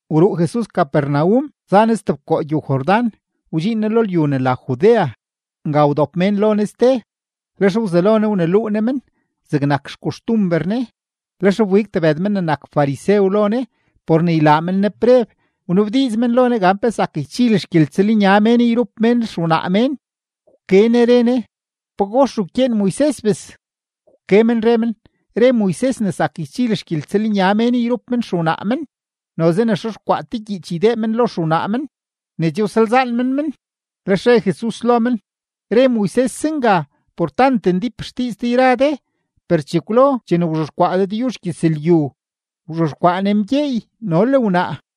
Wruu Jesus Capernaum za Ne stebkoo gyow-Jordán, wdxiin Ne lo lyu ne la Judea. Nga wdop mén lo Ne ste, lex wzelo Ne wneluu Ne men zegnak xkoxtumber Ne. Lex wbig tebëd men ne nak farisew lo Ne por ne ylaa men Ne preb; wnabdiiz men lo Ne gan pe zak ychil xgyeltsëlnya mén yrup mén xewnaa mén. Wke Ne re Ne: ―¿Pagox wkyeen Moises, bes? Wke men re men: ―Re Moises ne zak ybil xgyeltsëlnya mén yrup men xewnaa men, noze ne xexkwaa te gyiich ydee men lo xewnaa men ne che wsalzaan men men. Lex re Jesus lo men: ―Re Moises zenga por tant ndíp xdiiz de yra de. Per chekwlo chene wzhexkwaa Dëdyuzh gyëzlyu, “wzhexkwaa Ne mgyeey no le wnaa”.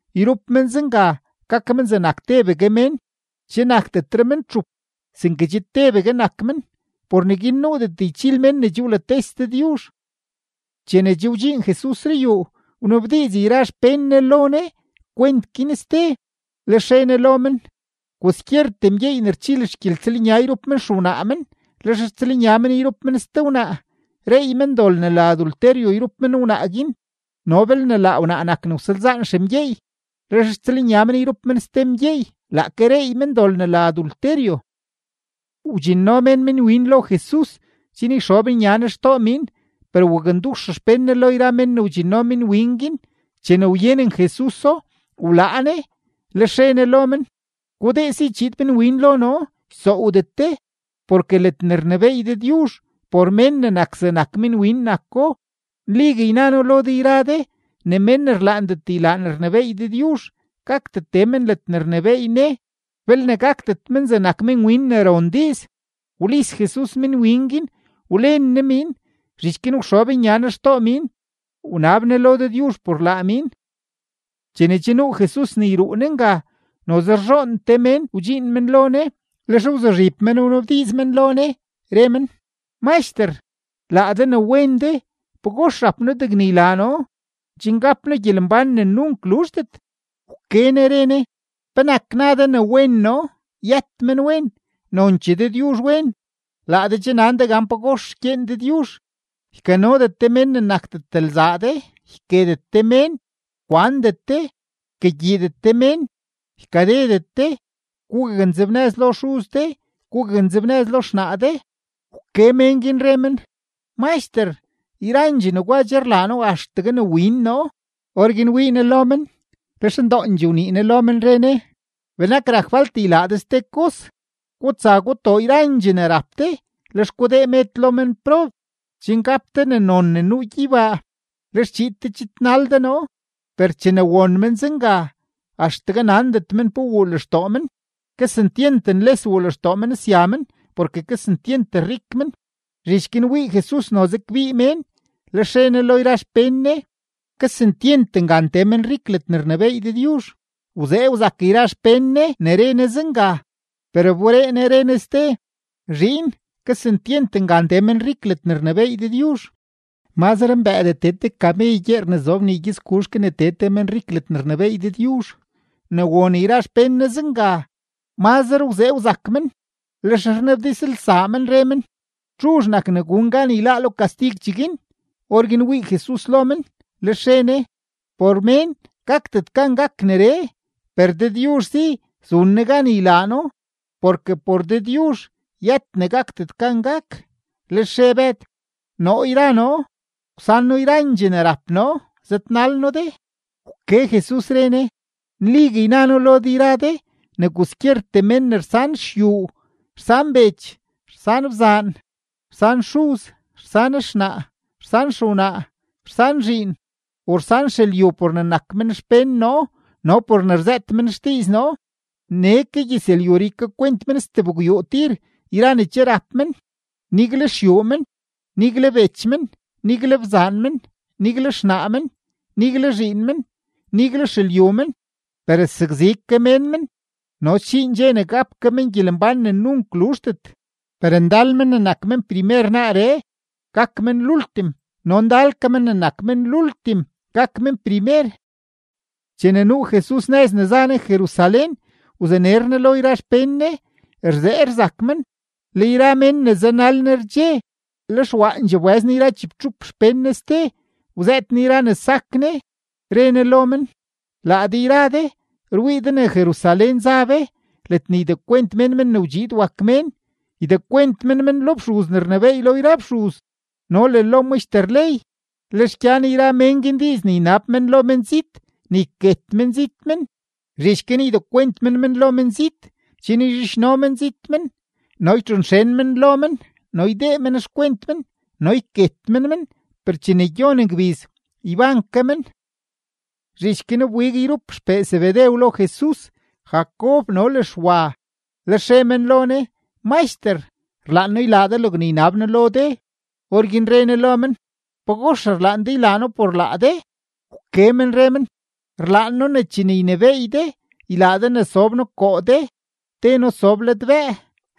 yrup men zenga gak men zegnak tebegue mén.” Che nakdetre men txup, sinke che tebegue nak men. Por neguin nuudet ychil mén ne che wlates Dëdyuzh. Chene che wdxiin Jesus ruyuu, wnabdiiz yra xpén Ne lo Ne kwent guin ste. Lex re Ne lo men: ―Kwaskyertee mgyeey ne rchil xgyeltsëlnya yrup men xewnaa men, lex rtsëlnya men yrup men ste wnaa, reey men dol ne la adulterio yrup men wnaa guin. No belne laa wnaa nak ne wsalzaan xemgyeey, lex rtsëlnya men yrup men ste mgyeey, laake reey men dol ne la adulterio. Wdxinno mén minwin lo Jesus chen yxob nya Ne xtoo miin; per wakndux xpén Ne lo yra men ne wdxinno minwin guin. Chene wyenen Jesuso, wlaa Ne, lex re Ne lo men: ―Gudee si chiid minwin lo noo, ysoowdet de, porke ledne rnebééy Dëdyuzh, por mén ne nak zegnak minwin nako. Nligue yna noo lo de yra de ne mén ne rlaandet ylaa ne rnebééy Dëdyuzh gakdet tee men ledne rnebééy Ne belne gakdet men zegnak minwin ne ron diiz. Wlis Jesus minwin guin wlen Ne miin, zhich guin wxob nya Ne xtoo miin, wnab Ne lo Dëdyuzh por laa miin. Chene che nuu Jesus ne yruu Ne nga, noze rzhoon te mén wdxiin men lo Ne. Lex wzuzhib men wnabdiiz men lo Ne, re men: ―Maxter, laa de ne wen de, ¿pagox rap noo degne ylaa noo chen gap noo gyelembán ne nunk luzhdet? Wke Ne re Ne: ―¿Penak na de ne wen noo? Yët menwen; nonchee Dëdyuzh wen. Laa de che nan de gan pagox rkyeen Dëdyuzh: “Ykanodet de mén ne nakdet lzaa de, yketet de mén, kwandet de, ykagyiidet de mén, ykadedet de, gugaknzebnëz lo xuz de, gugaknzebnëz lo xnaa de.” Wke mén guin, re men: ―Maxter, yrandxee negwa che rlaa noo axtegue ne win noo. Orguin wii Ne lo men, lex ndoondxee wnii Ne lo men, re Ne: ―Benak rak falt ylaa de ste kos: gutsa gutoo yrandxee ne rap de, lex gudee med lo menprob, chen gap de ne non ne nuu gyeybaa; lex chiid de chidnal de noo. Per chene won men zenga, axtegue nandet men pe wuu lextoo men, kesentyent nles wuu lextoo men sya men, porke kesentyent rik men. Zhich guin wii Jesus noze kbii mén, lex re Ne lo yra xpén Ne: ―¡Kesentyent ngan tee menrik ledne rnebééy Dëdyuzh! Wzee wzak yra xpén Ne ne re Ne zenga; per wberee Ne, re Ne ste: ―Zhiin, kesentyent ngan tee menrik ledne rnebééy Dëdyuzh. Mazre mbëëdee tee te kamey gyeer ne zob nii gyëtsguzh ke ne tee te menrik ledne rnebééy Dëdyuzh. Ne won yra xpén Ne zenga, mazre wzee wzak men, lex rnabdizlsaa men, re men: ―¿Txuzh nak ne gun gan yláá lo kastig cheguin? Orguin wii Jesus lo men, lex re Ne: ―Por mén gakdet gan gak neree, per Dëdyuzh si zun Ne gan ylaa No, porke por Dëdyuzh yët ne gakdet gan gak. Lex re Bëd: ―Noo yra noo, wsan noo yrandxee ne rap noo, zëdnal noo de. Wke Jesus, re Ne: ―Nligue yna noo lo de yra de ne kwaskyertee mén ne rsan xyuu, rsan bech, rsan bzaan, rsan xuz, rsan xnaa, rsan xewnaa, rsan zhiin, o rsan xelyu por ne nak men xpén noo no por ne rzëët men xdiiz noo, nee ke gyëzlyuree ykakwent men stebgwyuu tir yra ne che rap men: nigle xyuu men, nigle bech men, nigle bzaan men, nigle xnaa men, nigle zhiin men, nigle xelyu men, per sakzi ke mén men; no sdxiin dxe ne gap ke men gyelembán ne nunk luzhdet. Per ndal men ne nak men primer naaree, gak men lultim; no ndal ke men ne nak men lultim, gak men primer. Chene nuu Jesus nëz ne za Ne Jerusalén, wzaner Ne lo yra xpén Ne. Rzee rzak men, le yra mén ne zanal Ne rdxe. Lex waandxee wbëz Ne yra chibtxup xpén Ne ste, wzëët Ne yra ne sak Ne, re Ne lo men: ―Laa de yra de rwii de ne Jerusalén za be ledne ydekwent mén Men ne wdxiid wak Mén; ydekwent men men lo fxuz ne rnebééy lo yra fxuz no le lo maxter ley, lex gyan yra mén guin diiz ne ynab men lo menzit ne yket menzit men; zhich guin ydekwent men men lo menzit chen yzhidxno menzit men, no ytxonxen men lo men, no ydee men xkwent men, no yket men men; per chene gyon gbiz, yban ke men. Zhich guin wbig yrup xpee Zebedew lo Jesus, Jacob no le Xwa. Lex re men lo Ne: ―Maxter, rlaan noo ylaa de logne ynab noo lo de. Orguin re Ne lo men: ―¿Pagox rlaan de ylaa noo por laa de? Wke men re men: ―Rlaan noo ne chene ynebééy de, ylaa de ne sob noo koo de, te noo sob ladbëë,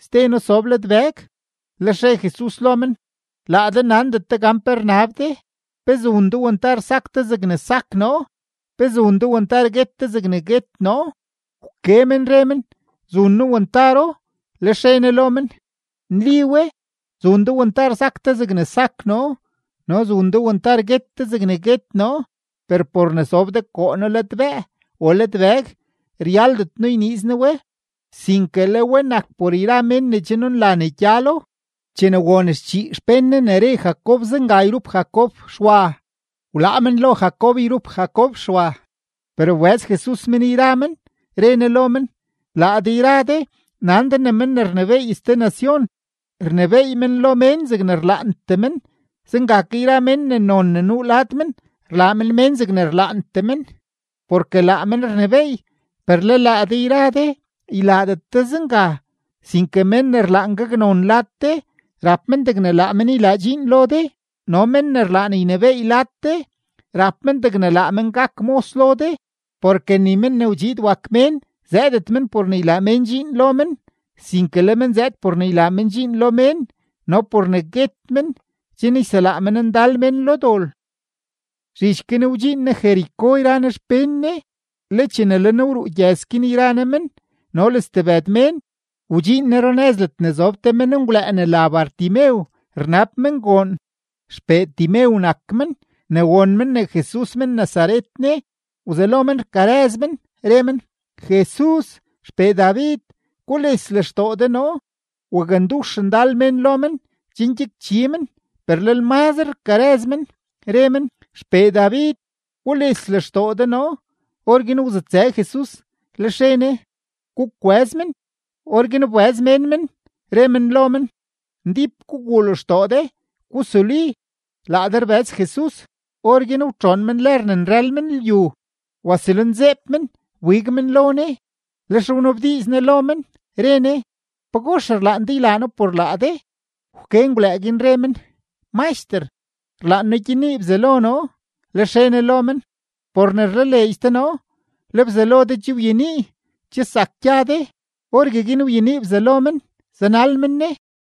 ste noo sob ladbëg. Lex re Jesus lo men: ―Laa de nandet de gan pe rnab de. ¿Pe zun de wantar sak de zegne sak noo? ¿Pe zun de wantar guet de zegne guet noo? Wke men re men: ―Zun noo wantaro. Lex re Ne lo men: ―Nli we, zun de wantar sak de zegne sak noo no zun de wantar guet de zegne guet noo, per por ne sob de koo noo ladbëë o ladbëg, ryaldet noo yniiz noo we, sinke le we nak por yra mén ne che nunla ne gyalo. Chene won schii xpén Ne ne re Jacob zenga yrup Jacob Xwa, wlaa men lo Jacob yrup Jacob Xwa. Per wbëz Jesus men yra men, re Ne lo men: ―Laa de yra de nan de ne men ne rnebééy ste nacion, rnebééy men lo mén zegne rlaantee men; zenga ke yra mén ne non ne nuu lad men, rlaa men mén zegne rlaantee men, porke laa men rnebééy. Per le laa de yra de ylaadet de zenga. Sinke men ne rlaan gaknon lad de, rap men degne laa men ylaa dxiin lo de. No men ne rlaan ynebééy lad de, rap men degne laa men gak mos lo de. Porke ni Men ne wdxiid wak Mén zëëdet men por ne ylaa mén dxiin lo men, sinke le men zëëd por ne ylaa men dxiin lo mén no por ne guet men chen yselaa men ndal mén lo dol. Zhich guin wdxiin Jesus Jericó yra Ne xpén Ne. Le chene le Ne wruu gyëz guin yra Ne men no le stebëd mén, wdxiin Ne runëz ledne zob te menngwlëë ne la Bartimeo rnab men goon, xpee Timeo nak men. Ne won men ne Jesus men-Nazaret ne, wzelo men rkarëz men, re men: ―¡Jesus, XPee David, gules lextoo de noo! Wakndux ndal mén lo men chen gyakchi men, per lel mazre rkarëz men, re men: ―¡XPee David, gules lextoo de noo! Orguin wzutsë Jesus, lex re Ne: ―Gukwëz men. Orguin wbëz mén men, re men lo men: ―Ndíp guguu lextoo de, gusuli. Laa de rbëz Jesus. Orguin wtxoon men lër ne nrël men lyu, wasulinzeeb men, wbig men lo Ne. Lex wnabdiiz Ne lo men, re Ne: ―¿Pagox rlaan de ylaa noo por laa de? Wke menngwlëë guin, re men: ―Maxter, rlaan noo gyenii bzalo noo. Lex re Ne lo men: ―Por ne rlaleedx de noo, le bzalo de che wyenii. Che zak gya de. Orgueguin wyenii bzalo men, zanal men Ne.